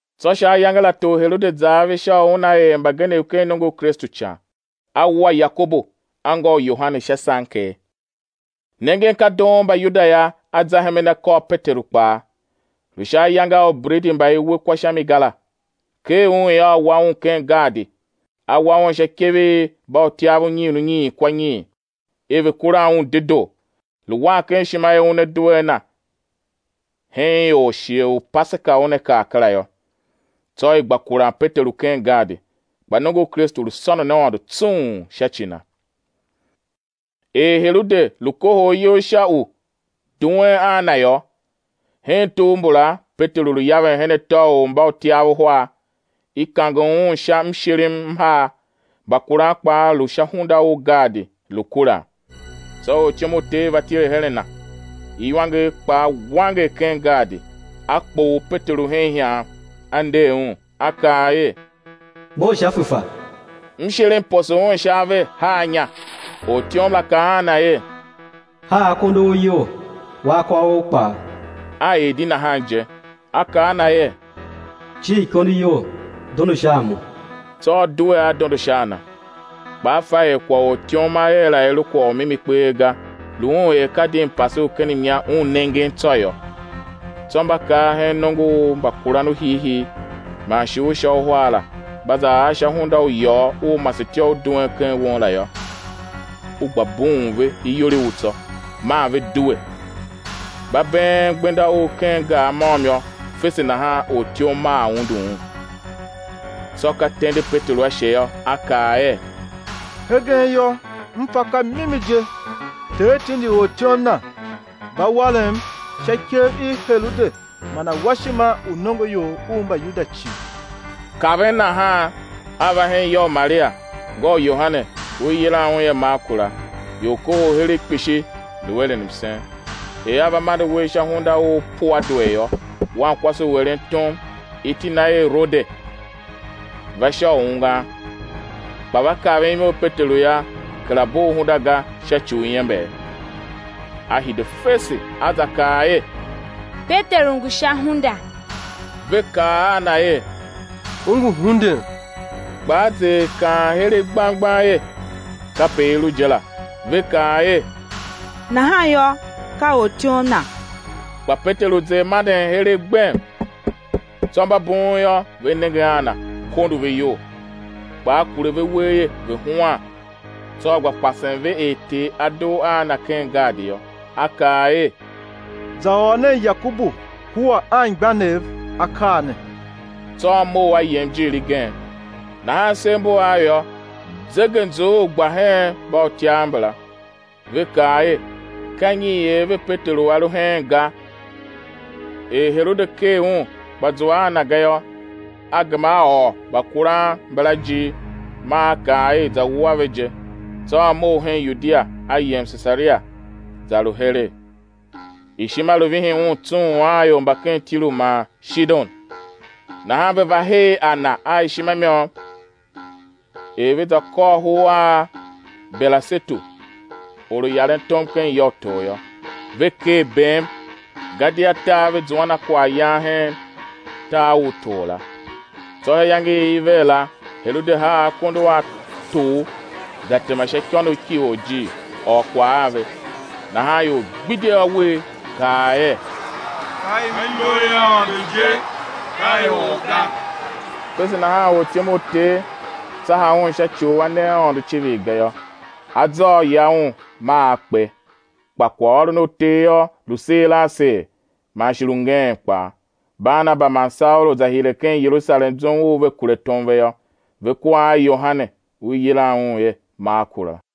Tsô sha ayange la tor Herode za ave sha u una er mbagenev ken nongo u Kristu ican. A wua Yakobu, anngô u Yohane, sha sanker. Nengen ka doon Mbayuda yô, a za hemen a kôr Peteru kpaa, lu sha ayange a ubredi mba i we kwa sha mi ga la. Ker un yô, a wa un ken gaadi, a wa un sha ikev i mbautyav unyiin unyiin kwa nyiin, er ve̱ kura un dedoo, lu wan ken ishima er una due a na hen ior shighe u Paseka una kar kera yô. Tsô i gba kuran Peteru ken gaadi; kpa nongo u Kristu lu sônon Aôndo tsung sha ci na. Er Herode lu kohol iyol sha u duen a na yô, hen tugh mbula Peteru lu yaven her atô u mbautyav uhar, i kange un sha mshirim m har; mbakuran kpaa lu sha hunda u gaadi, lu kuran. Tsô ortyom u Ter va tile hen a na, iwanger kpaa wanger ken gaadi, a kpoghol Peteru hen ihan, a nder un a kaa er: Mough sha fefa. Mshirim poso un sha ave, haa inya. Ortyom la kaa a na er: Haa akondo a ou iyol, wa akôv ou kpaa. A er di nahan je. A kaa a na er: Cir ikondo iyol, dondo sha a mo; tsô a due a dondo sha a na; kpa a fa er kwagh u ortyom a er la i lu kwagh u mimi kpee ga, lu un er ka di mpase u ken mnya un nengen tsô yô. Tsô mba kar hen nongo u mbakuran u hiihii man shi u sha uhar la, mba za ar sha hunda u iyôgh u masetyô u duen ken won la yô, u gba bughun ve iyol i u tsô; maa ve due, mba been gbenda u ken gar môm yô, fese nahan ortyom maa undu un. Tsô ka tende Peteru ashe yô, a kaa er: Hegen yô, m fa ka mimi je, Ter tindi ortyom Na, va warem sha ikev i Herode man awashima u nongoior u Mbayuda cii. Kaven nahan a va hen ya u Maria, ngô u Yohane, u i yilan un er Marku la; ior kohol heregh kpishi, lu eren msen. Er a va mande uwegh sha hunda u puadwer yô, wankwase u eren tom iti na er Rode va sha u ungwan. Kpa va kaven imo i Peteru yô, kera bugh hunda ga sha ci u iember, a hide fese, a za kaa er: Peteru ngu sha hunda. Ve kaa a na er: U ngu hunden. Kpa a zer kaan heregh gbang gbang er, kape i lu je la. Ve kaa er: Nahan yô, ka ortyom na. Kpa Peteru zer manden heregh gbem. Tsô mba bughun yô, ve nenge a na, kondo ve iyol. Kpa a kure ve uwegh er ve̱ huan, tsô a gba pasen ve er Ter A dugh a na ken gaadi yô, a kaa er: Za ôr nen Yakobu kua anmgbianev akaa ne. Tsô a mough a yem ijiir igen. Nahan sev mbu av yô, zegeanzughul gba hen mbautyav mbala, ve kaa er: Ka nyi i er ve Peteru a lu heen ga? Er Herode ker un, kpa zua a na ga yô, a gema a ôr mbakuran mbala ijir, maa a kaa er i̱ za wua ve je. Tsô a mough hen Yudia, a yem Sesaria, za lu heregh. Ishima lu vihin un tsung a ior mba ken Tiru man Shidon, nahan ve va her a na a ishima i môm. Er ve za kôr hur a Belasetu, or u yaren tom ken ya u tor yô, ve ker bem, gadia tar ve zuan a kwaghyan hen tar u tor la. Tsô sha iyange i i ver la, Herode haa akondo a tor za tema sha ikônough ki orjir, ôr kwagh a ve. Nahan ior gbidye awer, kaa er: Ka imo i Aôndo je, ka i or ga! Fese nahan ortyom u Ter tsaha un sha ci u a ne Aôndo icivir ga yô. Azôô ya un maa a kpe. Kpa kwaghôron u Ter yô, lu seer a seer man shi lu ngeen kpaa. Barnaba man Saulu za hire ken Yerusalem zum u ve kure tom ve yô, ve kua a Yohane u i yilan er Marku la.